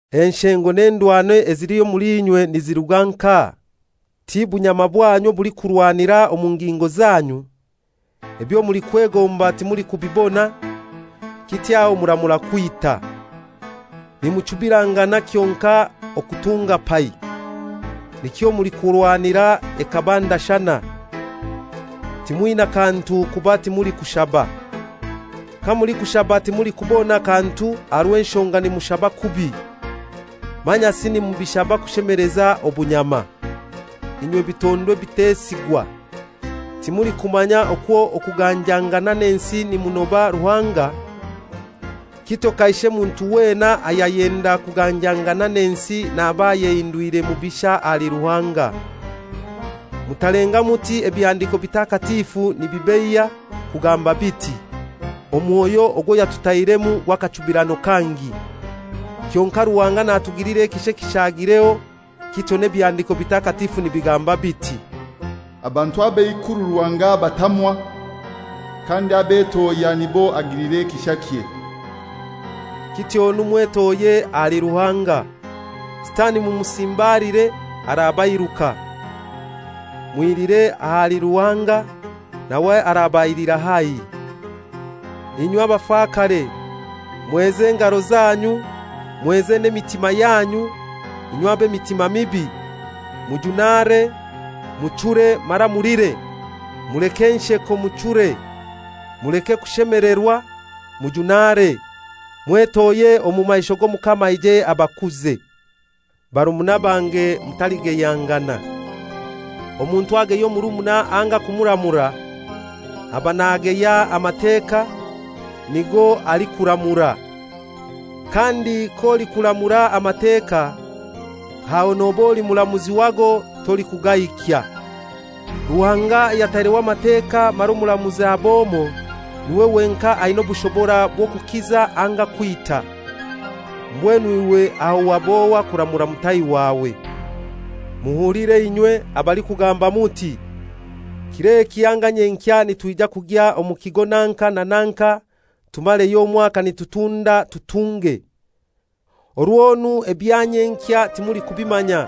Enshengo n'endwano ezili omuli inywe niziruga nkahai? Ti bunyama bwanyu obulikurwanira omu ngingo zanyu? Ebyo mulikwegomba timulikubibona; kityo aho muramura kwita. Nimuchubirangana kyonkai okutunga pai! Nikyo mulikurwanira ekaba ndashana. Timwina kantu kuba timulikushaba. Kamulikushaba timulikubona kantu aha rw'enshonga nimushaba kubi, manyasi nimubishaba kushemeleza obunyama. Inywe bitondwa bitesigwa! Timulikumanya okwo okuganjangana n'ensi nimunoba Ruhanga? Kityo kaishe muntu wena ayayenda kuganjangana n'ensi naba ayehindwire mubisha ahali Ruhanga. Mutalenga muti Ebihandiiko Bitakatifu nibibeiya, kugamba biti, «Omwoyo ogwo yatutairemu gw'akachubirano kangi.» Kyonkai Ruhanga natugilira ekisha ekishaagireho; kityo n'Ebihandiko Bitakatifu nibigamba biti, «Abantu ab'eikuru Ruhanga abatamwa, kandi abetohya nibo agilira ekishakye.» Kityonu mwetohye ahali Ruhanga. Sitani mumusimbaliire, arabairuka. Mwilire ahali Ruhanga, nawe arabailira haihi. Inywe bafakare, mweze engaro zanyu, mweze n'emitima yanyu, inywe ab'emitima mibi! Mujunare, muchure mara mulire. Muleke ensheko, muchure; muleke kushemelerwa, mujunare. Mwetohye omu maisho g'Omukama aije abakuze. Barumuna bange mutaligeyangana. Omuntu ageya omurumuna anga kumuramura, aba nageya Amateka, nigo alikuramura. Kandi k'olikuramura Amateka, aho noba oli muramuzi wago, tolikugahikya. Ruhanga ayataireho Amateka mara omuramuzi ab'omoi, niwe wenkai aina obushobora bw'okukiza anga kwita. Mbwenu iwe aho wab'ohai kuramura mutahi wawe? Muhulire inywe, abalikugamba muti, «Kir'eki anga nyenkya nitwija kugya omu kigo nanka na nanka, tumareyo omwaka nitutunda, tutunge;» orwonu ebya nyenkya timulikubimanya,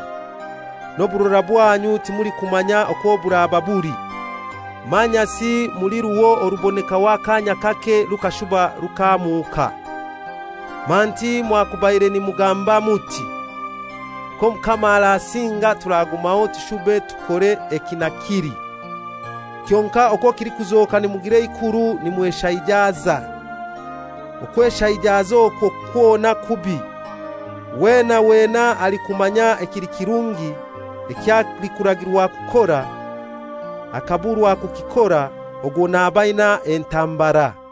n'oburora bwanyu timulikumanya kwo buraba buli. Manyasi muli ruho orubonekaho akaanya kake rukashuba rukamuuka. Manti mwakubaire nimugamba muti, «K'Omukama arasinga turagumaho tushube tukore eki na kili.» Kyonkai okwo kilikuzoka nimugira eikuru nimweshaijaza. Okweshaijaza okwo kwona kubi. Wena wena alikumanya ekili kirungi eky'alikuragirwa kukora, akaburwa kukikora, ogwo naba aina entambara.